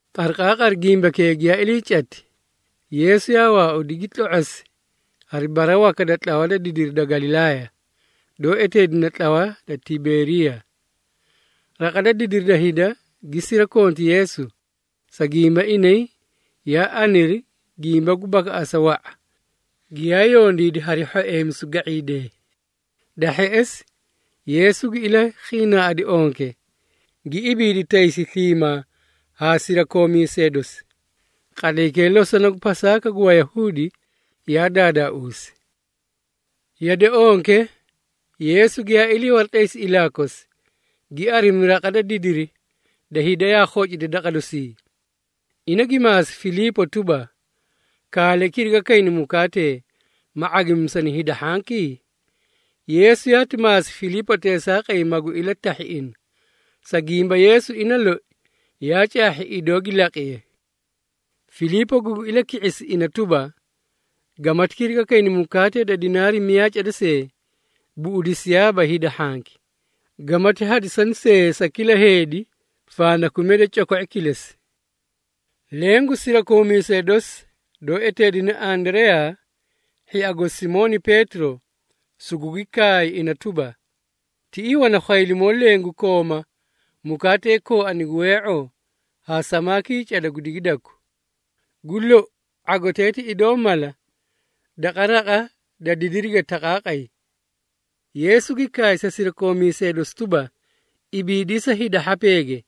Qariqaaqari gimbakee giyaa ilii cati, Yeesu yaa waaudi, gi tlo⁄osi hari bara waka da tlawa da didiri da Galilaaya, doó eteedine tlawa da Tiberiyaa. Raqa da didiri da hida gi sirakonti Yeesu, sa gimba inay yaa aniri gimba gu bakaꞌasa wa⁄a, giyaa yondiidi hari hhoeemisu ga⁄iidee. Da hheꞌesi, Yeesu gi ilakhiinaaꞌadi onke, gi ibiidi taysi sliimaa haa sirakoomiisee dosi. Qatlaykee losona gu Pasaaka gu Wayahuudi yaa daadaauusi. Yade onke, Yeesu giyaa ilii waratlaysi ilaa kosi, gi arimi raqa da didiri da hida yaa khocida daqa dosii. Ina gi maasi Filiipo tuba, “Kaale kiriga kayna mukaatee, ma ⁄agimisani hida hhanki?” Yeesu yaati maasi Filiipo teesaaqay magu ilatahhi ina, sa gimba Yeesu ina loi yaa caahhi idoo gi laqiye. Filiipo gugi ilaki⁄isi ina tuba, “Gamati kirigani mukaatee da dinaari miyaa cada see, buꞌudisiyaaba hida hhanki, gamati hadisani sa kila heedi fandakumiya da coko⁄i kilesi.” Leẽ gu sirakoomiisee dosi, doó eteedine Andareyaa, hhia gosi Simooni Peetiro, sugugi kaay ina tuba, “Tiꞌii wana khwaylimoo leẽ gu kooma mukaatee kooani gu wee⁄oo haa samaakii cada gu digidaku. Gu lou, ⁄agotee ti idoo mala daqa raqa da didirige taqaaqay!” Yeesu gi kaay sa sirakoomiisee dosi tuba, “Ibiidisa hida hhapeege.”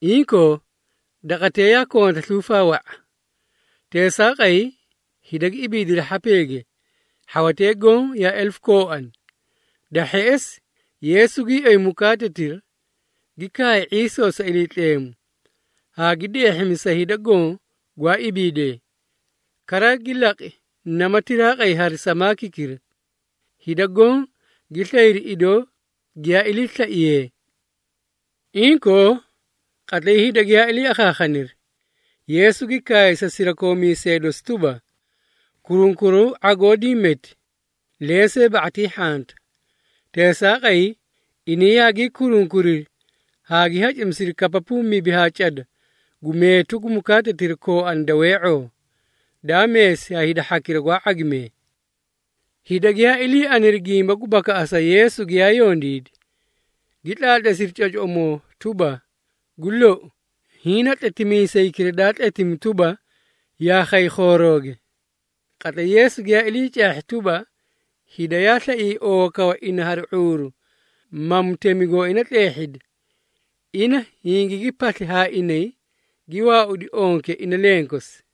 Inkoo, daqatee yaa konta sluufaa wa⁄a. Teesaaqay, hida gi ibiidiri hhapeege, hhawatee goõ yaa elefu kooani. Da hheꞌesi, Yeesu gii oyi mukaatetira, gi kaay ⁄iisoo sa Iliitleemu, haa gi deehhimi sa hida goõ gwaa ibiidee. Kara, gi laqi namati tiraaqay hari samaakikira. Hida goõ gi slayri idoo giyaa iliislaiye. Inkoo, qatlay hida giyaa ilii akhaakhaniri, Yeesu gi kaay sa sirakoomiisee dosi tuba, “Kurunkuraw ⁄agoo diĩ meti, lensee ba⁄atii hhanta.” Teesaaqay, inay yaagii kurunkuriri haa gi hacimisiri kapapuu mibi haa cada gu meetu gu mukaatetira kooani da wee⁄oo, daa meesi ha hida hhakira gwaa ⁄agimee. Hida giyaa ilii aniri gimba gu bakaꞌasa Yeesu giyaa yondiidi, gi tlaatleesiri cocoꞌomoo tuba, “Gu lou, hiĩ na Tletimiisaykira daa tletimi tuba, yaa khay khoorooge!” Qatlay Yeesu giyaa ilii caahhi tuba, hida yaa slaiyay oowakawa ina hari ⁄uuru, ma mutemi gooina tleehhidi, ina hingigi pasli haa inay gi waaudi onke ina lenkosi.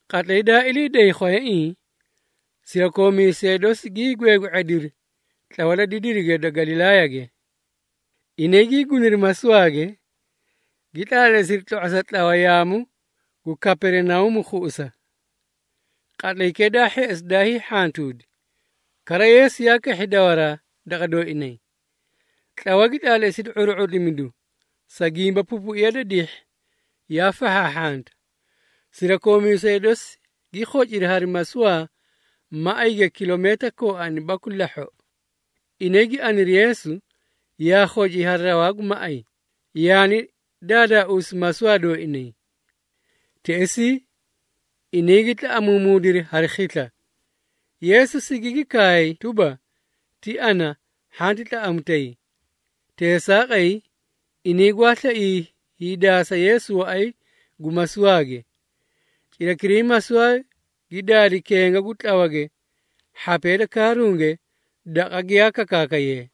Qatlay daa ilii day khwayaiĩ, sirakoomiisee dosi gii gweegwe⁄ediri tlawa da didirige da Galilaayage. Inay gii guniri masuwaage, gi tlaatleesiri tlo⁄osa tlawa yaamu gu Kaperinauumu khuꞌusa. Qatlaykee daa hheꞌesi daa hiihhantuudi, kara Yeesu yaa kahhi dawaraa daqa dooinay. Tlawa gi tlaatleesidi ⁄uru⁄utlimidu, sa gimba pupuiya da dihhi yaa fahhaahhanta. Sirakoomiisee dosi gi khociri hari masuwaa maꞌayge kilomiita kooani baku lahhoꞌo. Inay gi aniri Yeesu, yaa khoci hari rawaa gu maꞌay, yaani daadaauusi masuwaa dooinay. Teꞌesii, inay gi tlaꞌamuumuudiri hari khisla. Yeesu sigigi kaay tuba, “Ti ana, hhanti tlaꞌamutay!” Teesaaqay, inay gwaa slaiyay hiidaasa Yeesu waꞌay gu masuwaage. Cirakiray masuwaa gi daadi kenga gu tlawage hhapee da kaarunge, daqa giyaa kakaakayee.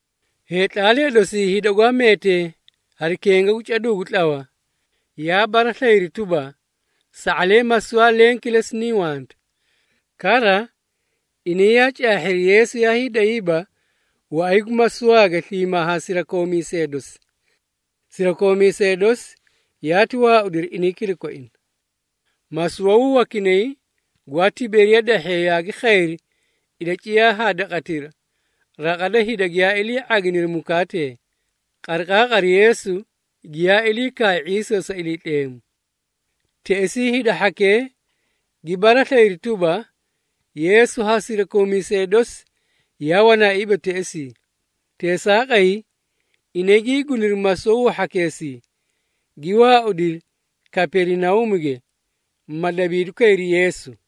Heetlaalee dosii hida gwaa meetee hari kenga gu caduu gu tlawa, yaa baraslayiri tuba, sa⁄alee masuwaa leẽ kilesi niĩ wanta. Kara, inay yaa caahhiri Yeesu yaa hiidayiiba waꞌay gu masuwaage sliimaa haa sirakoomiisee dosi. Sirakoomiisee dosi yaati waaudiri inay kilakoina. Masuwawuu wakinay gwaa Tiberiyaa dahhee yaagi khayri ilaciyaa haa daqatira, raqa da hida giyaa ilii ⁄aginiri mukaatee, qariqaaqari Yeesu giyaa ilii kaay ⁄iisoo sa Iliitleemu. Teꞌesii hida hhakee gi baraslayiri tuba, Yeesu haa sirakoomiisee dosi yaa wanaaiiba teꞌesii. Teesaaqay, inay gii guniri masuwawuu hhakeesii, gi waaudiri Kaperinauumuge, ma dabiidu kayri Yeesu.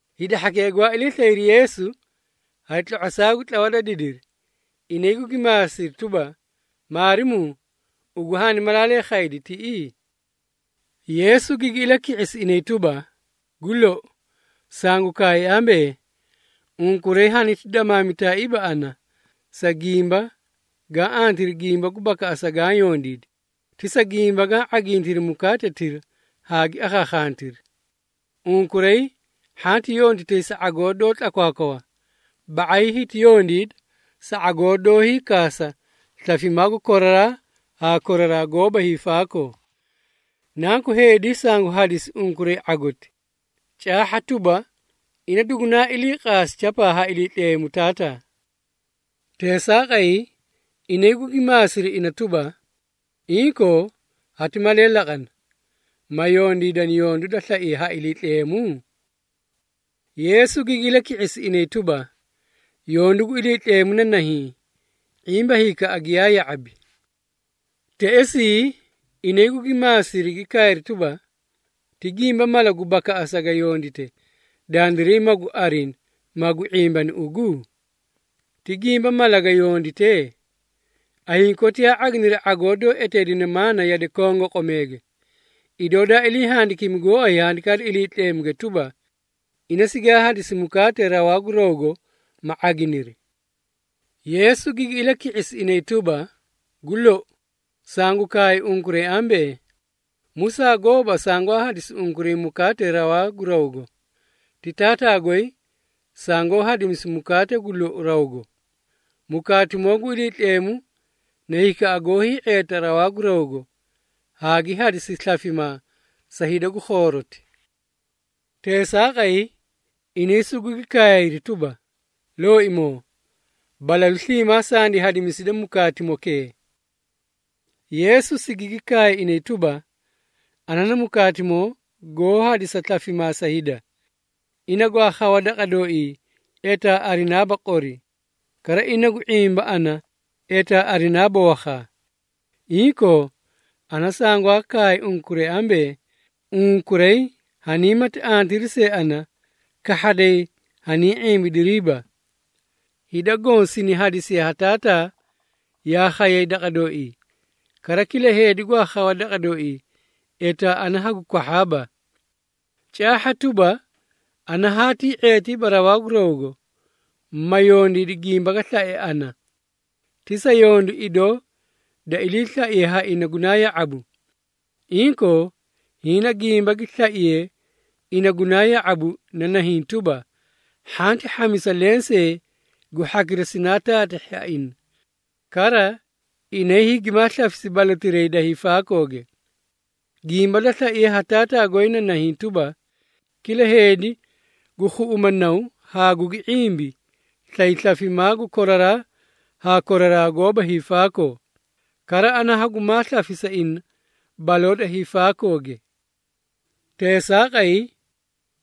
Hida hhakee gwaa ilii slayri Yeesu hari tlo⁄osaa gu tlawa da didiri, inay gugi maasiri tuba, “Maarimuu, ugu haani malaalee khaydi tiꞌii?” Yeesu gigi ilaki⁄isi inay tuba, “Gu lou, sangu kaay ambee, unkuray haniti damaamitaaiiba ana, sa gimba gaã antiri gimba gu bakaꞌasa gaã yondiidi, ti sa gimba gaã ⁄agintiri mukaatetira hagi akhakhantiri. Unkuray hhanti yonditay sa ⁄agoo doó tlakwaakwawa, ba⁄ay hiti yondiida sa ⁄agoo doó hiikaasa slafimaa gu koraraa haa koraraa goóba hiifaakoo. Nanku Heedi sangu hadisi unkuray ⁄agoti. Caahha tuba, ina dugunaa ilii qaasi chapaa ha Iliitleemu Taataa.” Teesaaqay, inay gugi maasiri ina tuba, “Inkoo, hati malee laqana, ma yondiidani yondu da slaiye ha Iliitleemu?” Yeesu gigi ilaki⁄isi inay tuba, “Yondu gu Iliitleemu na nahiĩ, ⁄imba hikaꞌa giyaa ya⁄abi.” Teꞌesii, inay gugi maasiri gi kaayri tuba, “Ti gimba mala gu bakaꞌasa ga yondite, dandiray magu arini, magu ⁄imbani ugu? Ti gimba mala ga yondite? Ayiĩ koti yaa ⁄aginiri ⁄agoo doó eteedine maana yade kongoqomeege, idoo daa ilii handikimi gooay Handikaa da Iliitleemuge tuba, ‘Ina sigaa hadisi mukaatee rawaa gu rawgo ma ⁄aginiri.’” Yeesu gigi ilaki⁄isi inay tuba, “Gu lou, sangu kaay unkuray ambee, Musaa gooba sangwaa hadisi unkuray mukaatee rawaa gu rawgo. Ti Taataa goy sangoó hadimisi mukaatimoo gu lou rawgo. Mukaatimoo gu Iliitleemu na hikaꞌa goó hii⁄eeta rawaa gu rawgo, haa gi hadisi slafimaa sa hida gu khooroti.” Teesaaqay, inay sugugi kaayri tuba, “Looimoo, balalu sliimaa sandi hadimiside mukaatimokee.” Yeesu sigigi kaay inay tuba, “Ana na mukaatimoo goó hadisa slafimaa sa hida. Ina gwaa khawa daqa dooii etaa arinaaba qori. Kara ina gu ⁄imba ana etaa arinaaba wakhaa. Inkoo, ana sangwaa kaay unkuray ambee, unkuray haniimati arintiri see ana, kahhaday haniĩ ⁄imbidiriiba. Hida goõ sini hadisiye ha Taataa yaa khayay daqa dooii. Kara kila heedi gwaa khawa daqa dooii, etaa ana hagu kwahhaaba. Caahha tuba, ana haatii ⁄eetiiba rawaa gu rawgo, ma yondiidi gimba ga slae ana, ti sa yondu idoo da iliislaiye ha ina gunaa ya⁄abu. Inkoo, hiĩ na gimba gi slaiye ina gunaa ya⁄abu na nahiĩ tuba, hhanti hhamisa lensee gu hhakira sinaa taatahhi ha ina. Kara, inay hagimaa slafisa balotirayi da hiifaakooge. Gimba da slaiye ha Taataa goy na nahiĩ tuba, kila heedi gu khuꞌuma Naw haa gugi ⁄imbi, slay slafimaa gu koraraa haa koraraa goóba hiifaakoo. Kara ana hagumaa slafisa ina baloo da hiifaakooge.” Teesaaqay,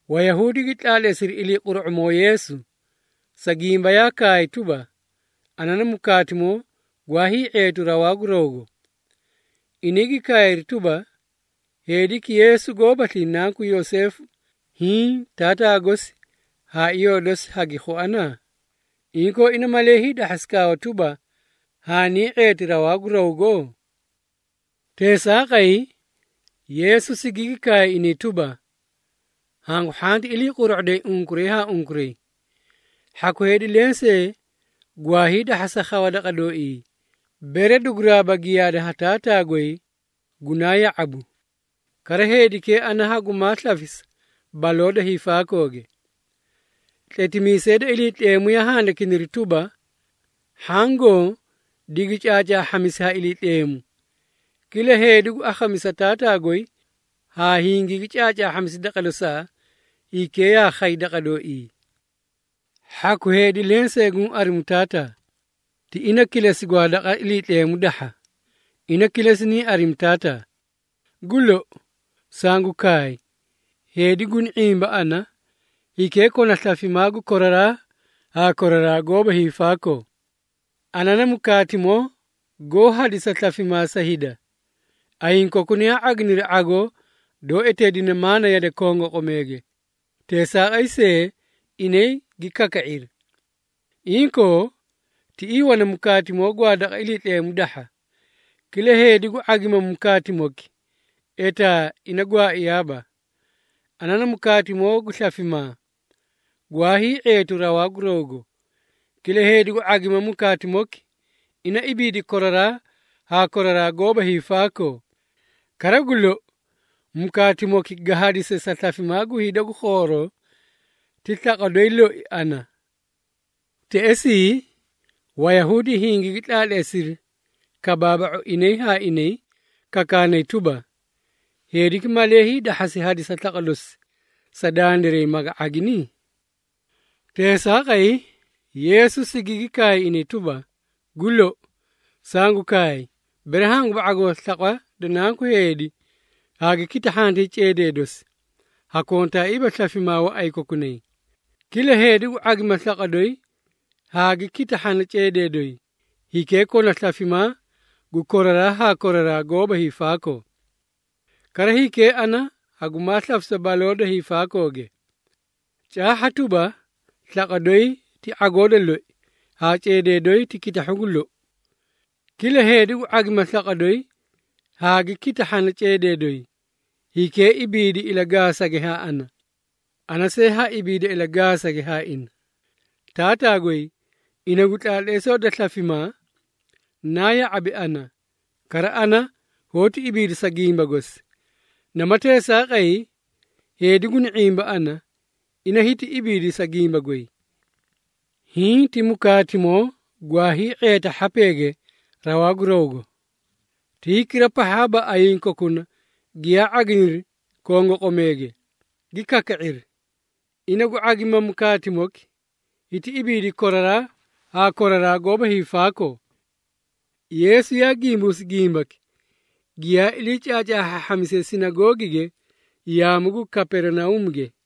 Wayahuudi gi tlaatleesiri iliiquru⁄umoo Yeesu, sa gimba yaa kaay tuba, “Ana na mukaatimoo gwaa hii⁄eetu rawaa gu rawgo.” Inay gi kaayri tuba, “Heediki Yeesu goóbaslii nanku Yoseefu, hiĩ taataa gosi haa iyoo dosi hagi khuana? Inkoo ina malee hiidahhasi kaawa tuba, ‘Haanii ⁄eeti rawaa gu rawgo?’” Teesaaqay, Yeesu sigigi kaay inay tuba, “Hangu hhanti ilii quru⁄uday unkuray haa unkuray. Hhaku heedi lensee gwaa hiidahhasa khawa daqa dooii, bere duguraaba giyaada ha Taataa goy gunaa ya⁄abu. Kara heedikee ana hagumaa slafisa baloo da hiifaakooge. Tletimiisee da Iliitleemu yaa handikiniri tuba, ‘Hhaã goõ digi caacaahhamisi ha Iliitleemu.’ Kila heedi gu akhamisa Taataa goy haa hingigi caacaahhamisi daqa dosaa, hikee yaa khay daqa dooii. Hhaku heedi lensee guũ arimu Taataa. Ti ina kilesi gwaa daqa Iliitleemu dahha, ina kilesi niĩ arimi Taataa. Gu lou, sangu kaay, heedi guni ⁄imba ana, hikee kona slafimaa gu koraraa haa koraraa goóba hiifaakoo. Ana na mukaatimoo goó hadisa slafimaa sa hida. Ayiĩ kokuna yaa ⁄aginiri ⁄agoo doó eteedine maana yade kongoqomeege, teesaaqay see, inay gi kaka⁄iri. Inkoo, tiꞌii wana mukaatimoo gwaa daqa Iliitleemu dahha. Kila heedi gu ⁄agima mukaatimoki, etaa ina gwaaiyaaba. Ana na mukaatimoo gu slafimaa, gwaa hii⁄eetu rawaa gu rawgo. Kila heedi gu ⁄agima mukaatimoki, ina ibiidi koraraa haa koraraa goóba hiifaakoo. Kara gu lou, mukaatimoki ga hadise sa slafimaa gu hida gu khooroo ti slaqwa doyi loi ana.” Teꞌesii, Wayahuudi hingigi tlaatleesiri kabaaba⁄u inay haa inay kakaanay tuba, “Heediki malee hiidahhasi hadisa slaqwa dosi sa dandiray maga ⁄agini?” Teesaaqay, Yeesu sigigi kaay inay tuba, “Gu lou, sangu kaay, bere hanguba ⁄agoo slaqwa da Nanku Heedi haa gi kitahhantay ceedee dosi, hakontaaiiba slafimaa waꞌay kokunay. Kila heedi gu ⁄agima slaqwa doyi haa gi kitahhana ceedee doyi, hikee kona slafimaa gu koraraa haa koraraa goóba hiifaakoo. Kara hikee ana hagumaa slafisa baloo da hiifaakooge. Caahha tuba, slaqwa doyi ti ⁄agoo da loi, haa ceedee doyi ti kitahhu gu lou. Kila heedi gu ⁄agima slaqwa doyi haa gi kitahhana ceedee doyi, hikee ibiidi ilagaasage haa ana, ana see ha ibiida ilagaasage haa ina. Taataa goy ina gu tlaatleesoo da slafimaa, naa ya⁄abi ana, kara ana hoóti ibiida sa gimba gosi. Namati teesaaqay, heedi guni ⁄imba ana, ina hiti ibiidi sa gimba goy. Hiĩ ti mukaatimoo gwaa hii⁄eeta hhapeege rawaa gu rawgo, ti hikira pahhaaba ayiĩ kokuna giyaa ⁄aginiri kongoqomeege gi kaka⁄iri. Ina gu ⁄agima mukaatimoki hiti ibiidi koraraa haa koraraa goóba hiifaakoo.” Yeesu yaa gimbuusi gimbaki, giyaa ilii caacaahhaahhamisiye sinagoogige yaamu gu Kaperinauumuge.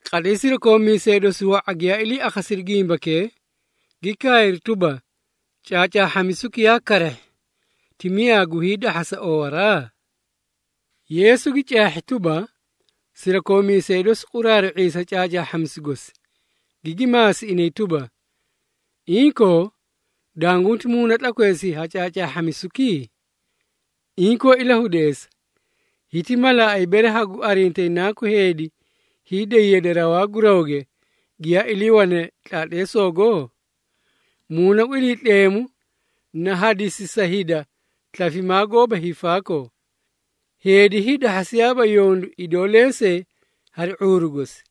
Qatlay sirakoomiisee dosi wa⁄a giyaa ilii akhasiri gimbakee, gi kaayri tuba, “Caacaahhamisuki yaa karahhi! Ti miyaa gu hiidahhasa oowaraa?” Yeesu gi caahhi tuba, sirakoomiisee dosi quraaru⁄iyay sa caacaahhamisu gosi, gigi maasi inay tuba, “Inkoo, dangunti muuna tlakweesii ha caacaahhamisuki? Inkoo ilahudeesa, hiti malaaꞌay bere hagu arintayi Nanku Heedi hiiday yade rawaa gu rawge, giyaa iliiwane tlaatleesogo? Muuna gu Iliitleemu na hadisi sa hida slafimaa goóba hiifaakoo. Heedi hiidahhasiyaaba yondu idoo lensee hari ⁄uuru gosi.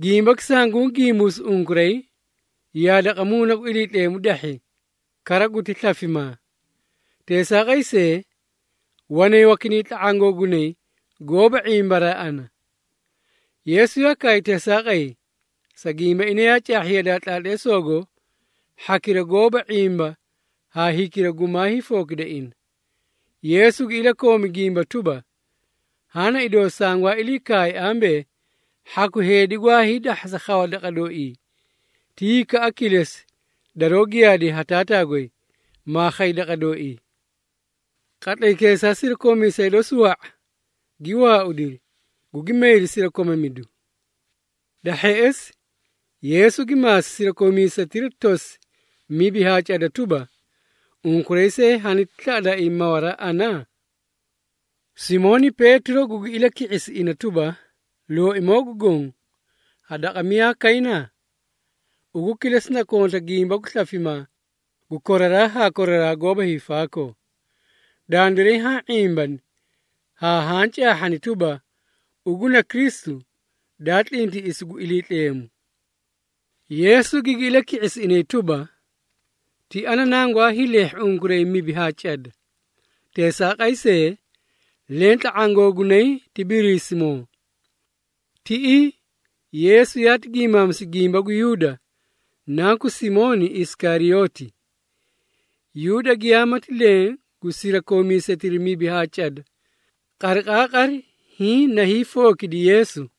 Gimbaki sanguũ gimbuusi unkuray, yaa daqa Muuna gu Iliitleemu dahhi, kara guti slafimaa. Teesaaqay see, wanay wakinay tla⁄aã googunay goóba ⁄imbaraa ana.” Yeesu yaa kaay teesaaqay, sa gimba ina yaa caahhi yadaa tlaatleesoogo hhakira goóba ⁄imba haa hikira gumaa hiifookida ina. Yeesu gi ilakoomi gimba tuba, “Haã na idoo sangwaa ilii kaay ambee, hhaku heedi gwaa hiidahhasa khawa daqa dooii, ti hikaꞌa kilesi daroó giyaadiye ha Taataa goy, maa khay daqa dooii.” Qatlaykeesaa sirakoomiisee dosi wa⁄a, gi waaudiri, gugi mayri sirakomamidu. Da hheꞌesi, Yeesu gi maasi sirakoomiisetira tosi mibi haa cada tuba, “Unkuray see haniti slaꞌadaaii mawaraa ana?” Simooni Peetiro gugi ilaki⁄isi ina tuba, “Looimoo gu Goõ, ha daqa miyaa kayna? Ugu kilesi na konta gimba gu slafimaa gu koraraa haa koraraa goóba hiifaakoo. Dandiray haã ⁄imbani haa haã caahhani tuba, ugu na Kristu, Daa tlintiꞌisi gu Iliitleemu.” Yeesu gigi ilaki⁄isi inay tuba, “Ti ana nangwaa hiileehhi unkuray mibi haa cada. Teesaaqay see, leẽ tla⁄aã googunay ti Biriisimoo!” Tiꞌii, Yeesu yaati giimaamisi gimba gu Yuuda, nanku Simooni Isikariyooti. Yuuda giyaamati leẽ gu sirakoomiisetira mibi haa cada, qariqaaqari hiĩ na hiifookidi Yeesu.